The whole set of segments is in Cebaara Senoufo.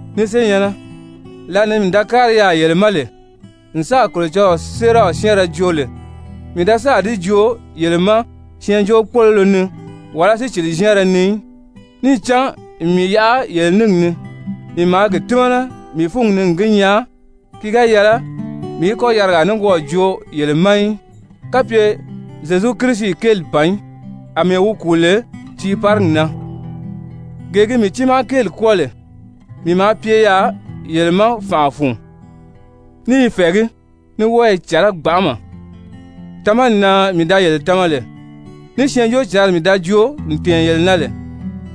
Ni senyɛ̀nnɛ, lǎlee ni mii da kári yaà yele ma lè n sáà Kolocɔlɔɔ séeraw syɛ́ɛnrɛ joo lè, mii da sáà di joo yele ma syɛɛnjóokpoloro ni wàlá sícili-zyɛ́ɛnrɛ ni í. Níì cán n mii yaʔa yele níngi ni, mii maa gi tímana mii fúngi ni n gi nyaa, ki ga yɛlɛ mii í kɔ́ yarigaa nikwɔɔ joo yele ma í, kapye Zyezu Kirisi kéeli ban í, àmɛɛ wi kùu lè tiiparigi na. Gee gi mii tiimaa kéeli kwɔ́ɔ lè, mii maa pye yaà yele ma fànʔa fun, ní i fɛ̀ɛgí, ní wɔ́ɔ i cɛ̀lɛ́ gbanʔama. Tamani na mii da yele tama lè, ní Syɛɛnjóocǎnri mii da joo n tɛ̀ɛn yele na lè,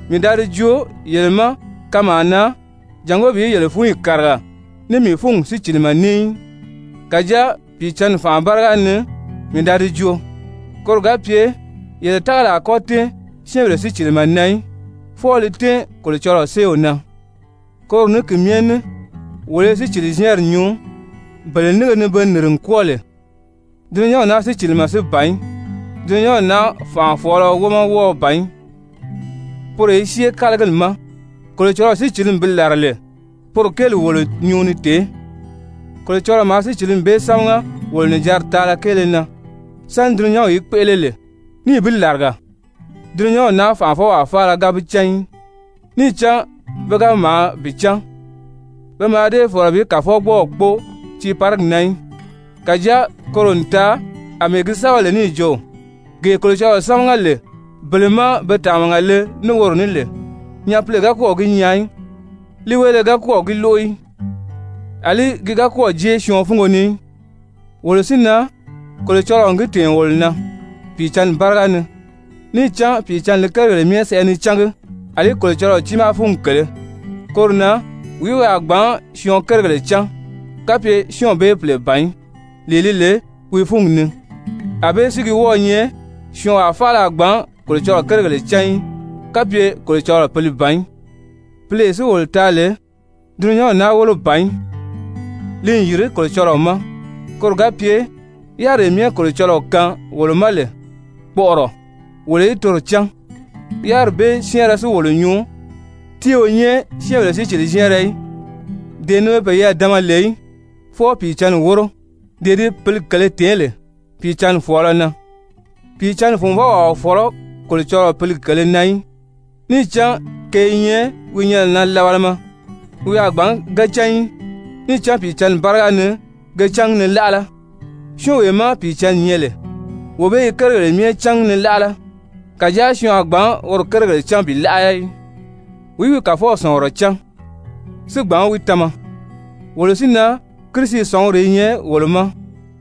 mii da di joo yele ma kanmaa na jàngó bi yele fúnyi kàriga ní mii fúngi sícilimɛ ní í. Kàjáa Pìicǎnni fànʔa báriga ni mii da di joo, koro ga pye yele tágali a kɔ́ tɛ́ɛn syɛ́ɛnbèle sícilimɛ na í, fwɔɔ li tɛ́ɛn Kolocɔlɔɔ séew na. Koro ní ki myɛ ní wolo i sícili-zyɛ́ɛnri nyuu bele nínge ni be nìri n kwɔ́ɔ lè, dulunyanw naa sícilimɛ si ban í, dulunyanw naa fànʔafɔɔlɔ wómɔ wɔ́ɔ ban í, poro i syée kálagili ma. Kolocɔlɔɔ sícilimi bi làra lè, poro kéeli wolo nyuu ni tèé, Kolocɔlɔɔ maa sícilimi bee sámaga wolo nìjanri taala kéele na sáni dulunyanw í kpéʔele lè, níì bi làriga. Dulunyanw naa fànʔafɔwaa faala ga bi cán í. Níì cán pe ga maa bi cán, pe mǎà dée fɔ̀lɔ bi Kàfɔgbɔɔw kpóo tiiparigi na í. Kàjáa koro n taa àmɛɛ gi sɛ́bɛ lè níì jo: «Gee Kolocɔlɔɔ sámaga lè bele má be tàmaga le ní woro ní lè, nyapile ga kɔ́ɔ̀ gi nyaa í, líiweele ga kɔ́ɔ̀ gi lóʔo í, àlí ki ga kɔ́ɔ̀ jée syɔɔn fúngo ni í.» Wolo si na, Kolocɔlɔɔ n gi tɛ̀ɛn wolo na Pìicǎnni báriga ni, níì cán Pìicǎnni li kérigèle myɛ sɛʔɛ ni cángi, àlí Kolocɔlɔɔ tiimaa fúngi kèlē. Koro na wìí wi a gbǎn syɔɔn kérigèle cán, kapye syɔ́ɔnw bee pìle ban í, lee li lè wi fúngi ni? Anbée si gi wɔ́ɔ̄ nyɛ, syɔɔnwaa faala a gbǎn Kolocɔlɔɔ kérigèle cán í, kapye Kolocɔlɔɔ Pǐli ban í. Pǐlee si wolo taa lè, dulunyanw naa wólo ban í, li n yìri Kolocɔlɔɔ ma, koro ga pye yáriree myɛ Kolocɔlɔɔ kaan wolo ma lè kpɔʔɔrɔ, wolo í toro cán. Yáriri bee syɛ́ɛnrɛ si wolo nyuu, ti o nyɛ syɛ́ɛnbèle sícili-zyɛ́ɛnrɛ í, dee ni be peyɛɛ dama lè í, fwɔɔ Pìicǎnni wóro, dee di Pǐli kèlē tèé lè Pìicǎnni fɔ̀ɔlɔ na. Pìicǎnni funvɔwaa o fɔ̀lɔ́ Kolocɔlɔɔ Pǐli kèlē na í, níì cán ke i nyɛ wi nyɛnɛ na labalama, wi a gbǎn ge cán í, níì cán Pìicǎnni báriga ni ke cángi ni láʔala. Syɔ́ɔnwee má Pìicǎnni nyɛ lè, wee bee i kérigèle myɛ cángi ni láʔala, kàjáa syɔɔn a gbǎn woro kérigèle cán bi láʔala í. «Wìí wi Kàfɔw sɔ̀ngurɔ cán si gbǎn wi tama?» Wolo si na, Kirisi sɔ̀nguri i nyɛ wolo ma.